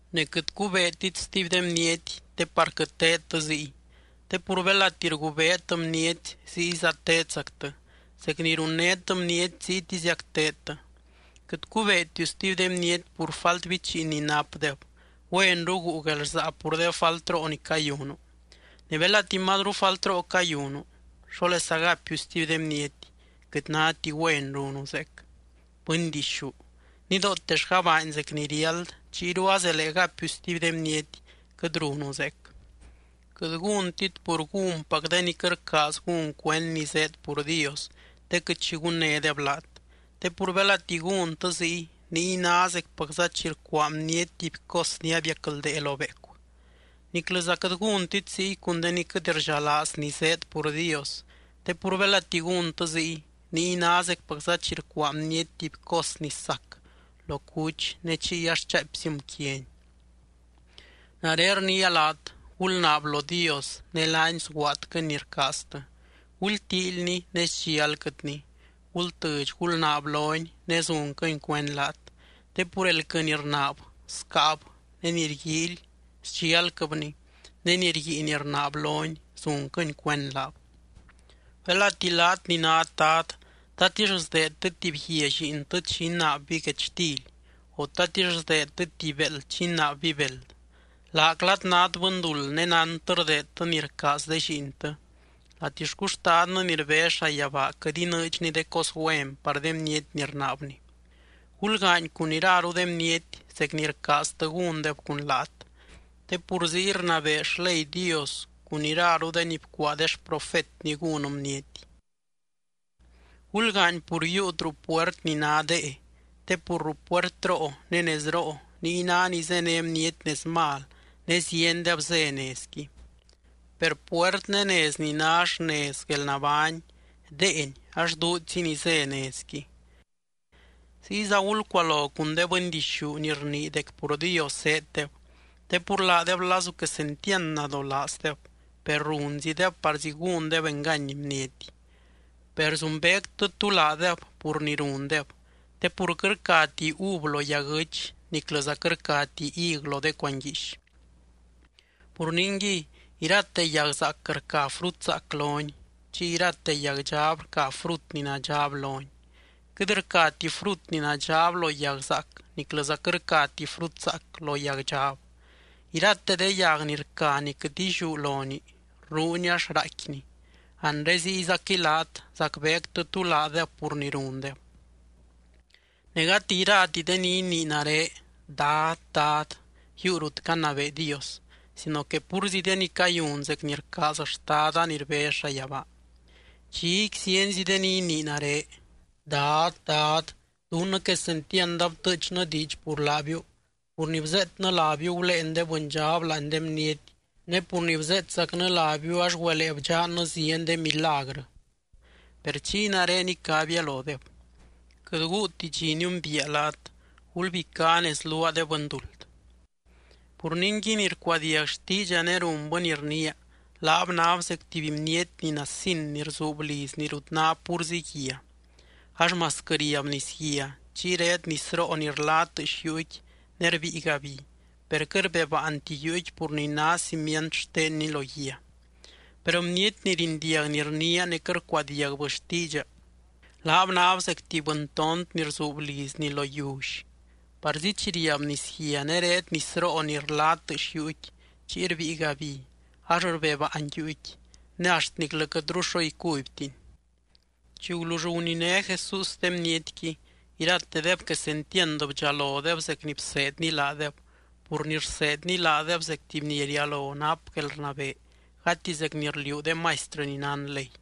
’Ne quɨt cubeetit stuby de bniety, te par quɨt teedtɨ ziy. Te pur belati rgubeet bniety ziyza teedzactɨ, zec ni runnét bniety ziytiziac teedtɨ. Quɨt cubeetiu stuby de bniety pur falt bichiin ni napdeb, güenru guu guelrsaa pur de faltroo ni cayunu. Ne belati mazru faltroo cayunu, ¿xólesa gapiu stuby de bniety: “Quɨt náti güen runu zeec?” ¡Bɨndixú! Nidootellga baany zec ni riáld, chiyru azelee gapiu stuby de bniety: Quɨt runu zeec. ’Quɨt gúntit pur gúnpac de ni quɨt rcaaz gún cuend ni zéed pur Dios, te quɨt xi gunnédeb laat. Te pur belati gúntɨ ziy, niy ná zecpacza chi rcuaa bniety tuby cos ni abiacldee lo beecu. Niclɨza quɨt gúntit ziy cun de ni quɨt rdxalaaz ni zéed pur Dios. Te pur belati gúntɨ ziy, niy ná zecpacza chi rcuaa bniety tuby cos ni sac lo cuch ne chiy ax chaaipzim quiani. ’Nare rniia laat: Gulnaab lo Dios ne laany sguaadquɨny ni rcaaztɨ. Gultíilny ne sdxialquɨtny. Gultɨdx gulnaab lony, ne zunquɨny cuend laat. Te pur elquɨ ni rnaab, scáab. Ne ni rguíily, sdxialquɨbni. Ne ni rguiin rnaab lony, zunquɨny cuend laab. ’Belati laat ni nát dad, ¿tatix sdeedtɨ tuby guia lliintɨ chi inaabby guechtily? O, ¿tatix sdeedtɨ tuby béeld chi inaabby beld? Laaclat nát bɨnduld ne nántɨ rdeedtɨ ni rcaaz de lliintɨ, ¡latixcu Xtadnɨ ni rbez llayabaa quɨt inɨɨdxny de cos güen par de bniety ni rnaabni! ’Gulgaany cun iraru de bniety zec ni rcaaztɨ gúndeb cun laat. Te pur ziy rnabee xley Dios cun iraru de ni bcuaa de xprofetny gún bniety. ’Gulgaany pur yiiut ruu puert ni ná dee. Te pur ruu puertroo ne nezroo, niy ná ni zéne bniety nez mal ne ziendeb zé nezqui. Per puert ne nez ni ná xnez guelnabány, deeni ax duudxzi ni zé nezqui. ’Ziyza gulcualo cun de bɨndixú ni rnii dec pur Dios zéeddeb. Te pur laadeb lazu quesentiand nadolaazdeb, per runzideb parzí gúndeb engany bniety. Per zumbeectɨ tú laadeb pur ni rundeb, te pur quɨt rcati uv lo yaguɨ́ch niclɨza quɨt rcati hig lo de cuanguiix. Pur ningui, irate yag zaac rca frut zaac lonii. Chiy irate yag dxab rca frut ni nadxab lonii. Quɨt rcati frut ni nadxab lo yag zaac niclɨza quɨt rcati frut zaac lo yag dxab. Irate de yag ni rca ni quɨt illiú lonii, rruni ax raaicquini. Anre ziyzaquɨy laat, zacbeectɨ tú laadeb pur ni rundeb. ’Ne gati irati de ni inii nare: “Dad, Dad”, yiiu rut canabee Dios sino que púrzi de ni cayun zec ni rcaaz Xtada ni rbez llayabaa. Dxiqui zienzi de ni inii nare: “Dad, Dad, dunnɨ quesentiand abtɨɨchnɨ diidx pur laabiu, pur ni bzeetnɨ lábiu guléen de bɨndxab láani de bniety, ne pur ni bzeetzacnɨ lábiu ax güelee bdxannɨ zieny de milagrɨ.” Per chiy nare icabia lodeb: “Quɨt guuti dxi niumbiia laat. Gulbicá nez luaa, de bɨnduld.” ’Pur ningui, ni rcuadiag xtiidxa ne runbɨ ni rniia, laab náb zec tuby bniety ni nasin ni rzuub lizni rut ná púrzi guia. Ax masquɨ riab nisguia, chiy reed nisroo ni rla tɨɨx yuuqui ne rbíiga bi, per quɨt rbebaanti yuuqui pur ni ná cimient xtenni lo guia. Per bniety ni rindiag ni rniia ne quɨt rcuadiagbɨ xtiidxa, laab náb zec tuby bɨntont ni rzuub lizni lo yiully. Parzi chi riab nisguia ne reed nisroo ni rla tɨɨx yuuqui chiy rbíiga bi, ax rbebaan yuuqui. ¡Ne axt niclɨ quɨtru xo icubytiy! Chi gulull guniné Jesús de bnietqui, iratedeb quesentiand bdxalodeb zec ni bseedny laadeb pur ni rseedny laadeb zec tuby ni rialo nap guelrnabee, gati zec ni rliuu de maistrɨ ni nán ley.